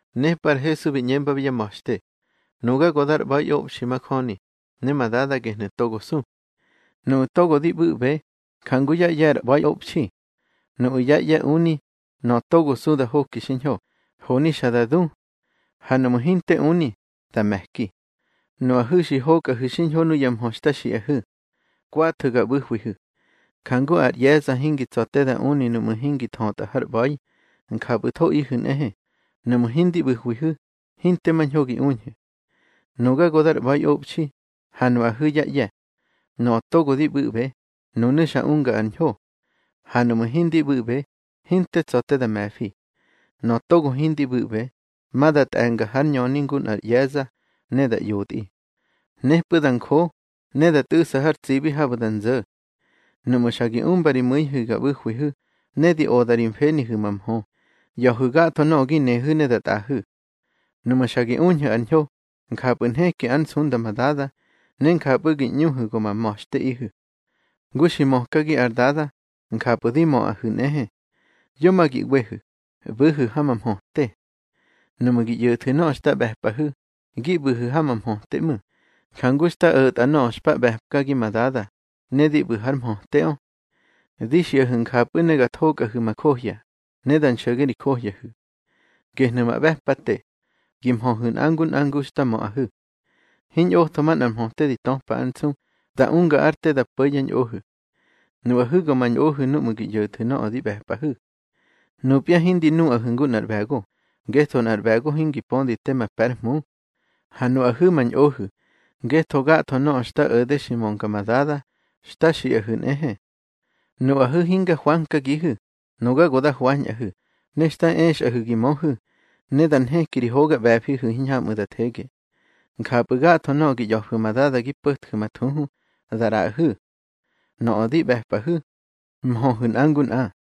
Nepꞌu̱ ar Hesu bi ꞌñembabi yá ma̱xte: —Nuga go dar ꞌba̱iꞌobxi majöni, ne ma Dada gehnu̱ togo su. Nuꞌu̱ togo di ꞌbu̱ꞌbe, jangu yá ꞌye̱ ar ꞌba̱iꞌobxi. Nuꞌu̱ yá ꞌye̱ uni, nöꞌö togo su da hoki xiñho, honi xa da du. Ha nuꞌmu̱ hinte uni, da me̱ki. Nuꞌahu̱ xi hokꞌahu̱ xiñho nuya mhö xta xiꞌahu̱. Kwathu̱ ga ꞌbu̱hwihu̱. Jangu ar ꞌye̱za hingi tsa̱ te da uni nuꞌmu̱ hingi thötꞌa hár ꞌba̱i, njapꞌu̱thoꞌihu̱ nꞌehe, nuꞌmu̱ hindi ꞌbu̱hwihu̱, hinte mañho gi uñhu̱. Nuga go dar ꞌba̱iꞌobxi, ha nuꞌahu̱ yá ꞌye̱. Nöꞌö togo di ꞌbu̱ꞌbe, nunu̱ xa unga ar ñho. Ha nuꞌmu̱ hindi ꞌbu̱ꞌbe, hinte tsa̱ te da me̱fi. Nöꞌö togo hindi ꞌbu̱ꞌbe, ma da tꞌe̱nga har ñöni ngu nꞌar ꞌye̱za, ne da ꞌyotꞌi. Nepꞌu̱ da njo, ne da tꞌu̱ꞌsa har tsibi habu̱ da nzo̱. Nuꞌmu̱ xa gi umba ri mu̱ihu̱ ga ꞌbu̱hwihu̱, ne di oda ri mfenihu̱ ma mhö, ꞌya̱hu̱ gatho nöꞌö gi nehu̱ ne da tꞌaꞌahu̱. Nuꞌmu̱ xa gi uñhu̱ ar ñho, njapꞌu̱ nheki ár nsunda ma Dada, ne njapꞌu̱ gi ꞌñuhu̱ go ma ma̱xteꞌihu̱. Ngu xi mökagi ar Dada, njapꞌu̱ di möꞌahu̱ nꞌehe. Yo ma gi ꞌwehu̱, ꞌbu̱hu̱ ha ma mhöte. Nuꞌmu̱ gi ꞌyo̱thu̱ nöꞌö xta ꞌbe̱pꞌahu̱, gi ꞌbu̱hu̱ ha ma mhöte ꞌmu̱, jangu xta o̱tꞌa nöꞌö xpa ꞌbe̱pkagi ma Dada, ne di ꞌbu̱ hár mhöteꞌö. Di xiꞌahu̱ njapꞌu̱ ne ga thokꞌahu̱ ma johya, ne da nxo̱ge ri johyahu̱. Gehnu̱ ma ꞌbe̱pate: Gi mhöhu̱ nꞌa ngu nꞌa ngu xta möꞌahu̱. Hiñꞌotho manꞌar mhöte di töpa ár nsu, da unga ár te da po̱ yá ñꞌohu̱. Nuꞌahu̱ go ma ñꞌohu̱ nuꞌmu̱ gi ꞌyo̱thu̱ nöꞌö di ꞌbe̱pꞌahu̱. Nupya hindi nuꞌahu̱ ngu nꞌar ꞌbe̱go, ngetho nꞌar ꞌbe̱go hingi pödi tema pe̱ ár hmu. Ha nuꞌahu̱ ma ñꞌohu̱, ngetho gatho nöꞌö xta o̱de xi mönga ma Dada, xta xiꞌahu̱ nꞌehe. Nuꞌahu̱ hinga hwankagihu, nuga go da hwañꞌahu̱, ne xta exꞌahu̱ gi möhu̱, ne da nheki ri hoga ꞌbe̱fihu̱ hiñhamꞌu̱ da thege. Njapꞌu̱ gatho nöꞌö gi ꞌya̱fu̱ ma Dada gi po̱tju̱ ma thuhu, da ꞌraꞌahu̱. Nöꞌö di ꞌbe̱pꞌahu̱: Mhöhu̱ nꞌa ngu nꞌa.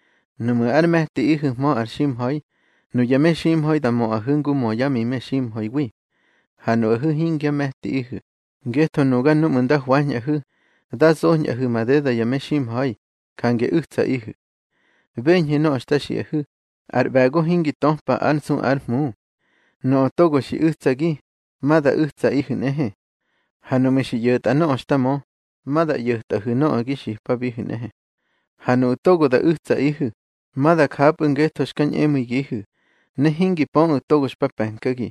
Nuꞌmu̱ ár me̱tiꞌihu̱hmö ar ximha̱i, nuya meximha̱i da möꞌahu̱ ngu mö yá mi meximha̱iwi. Ha nuꞌahu̱ hingyá me̱tiꞌihu̱, ngetho nuga núꞌmu̱ nda hwañꞌahu̱, da zoñꞌahu̱ madeda ya meximha̱i, jange u̱tsaꞌihu̱. Beñhu̱ nöꞌö xta xiꞌahu̱, ar ꞌbe̱go hingi töpa ár nsu ár hmu. Nöꞌö togo xi u̱tsagi, ma da u̱tsaꞌihu̱ nꞌehe. Ha nuꞌmu̱ xi ꞌyo̱tꞌa nöꞌö xta mö, ma da ꞌyo̱tꞌahu̱ nöꞌö gi xipabihu̱ nꞌehe. Ha nuꞌu̱ togo da u̱tsaꞌihu̱, ma da japꞌu̱ ngetho xka ñꞌemu̱igihu̱, ne hingi pöꞌu̱ togo xpa pe̱nkagi.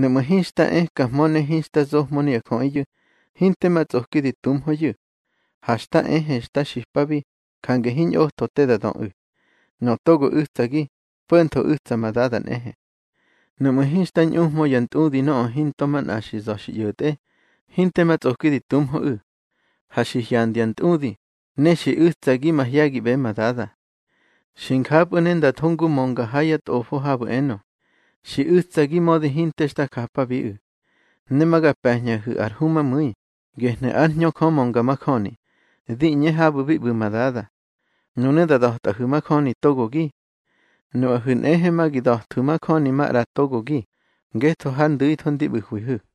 Nuꞌmu̱ hinxta ekahmö ne hinxta zohmö nuya jöꞌiyu̱, hinte ma tsꞌoki di tuhmöyu̱. Ha xta ehe xta xipabi, jange hiñꞌotho te da döꞌu̱. Nöꞌö togo u̱tsagi, po̱ntho u̱tsa ma Dada nꞌehe. Nuꞌmu̱ hinxta ñꞌuhmö ya ntꞌudi nöꞌö hinto manꞌa xi za̱ xi ꞌyo̱tꞌe, hinte ma tsꞌoki di tuhmöꞌu̱. Ha xi hyandya ntꞌudi, ne xi u̱tsagi mahye̱giꞌbe ma Dada. Xi njapꞌu̱ ne nda tho ngu mönga ha yá tꞌofo habu̱ enö: Xi u̱tsagi mödi hinte xta japabiꞌu̱. Ne ma ga pe̱ñꞌahu̱ ar Humamu̱i, gehnu̱ ár Hñö Jö mönga majöni, di ꞌñe habu̱ bi ꞌbu̱ ma Dada. Nunu̱ da da̱tꞌahu̱ majöni togogi. Nuꞌahu̱ nꞌehe ma gi da̱thwu̱ majöni maꞌra togogi, ngetho har ndu̱itho ndi ꞌbu̱hwihu̱.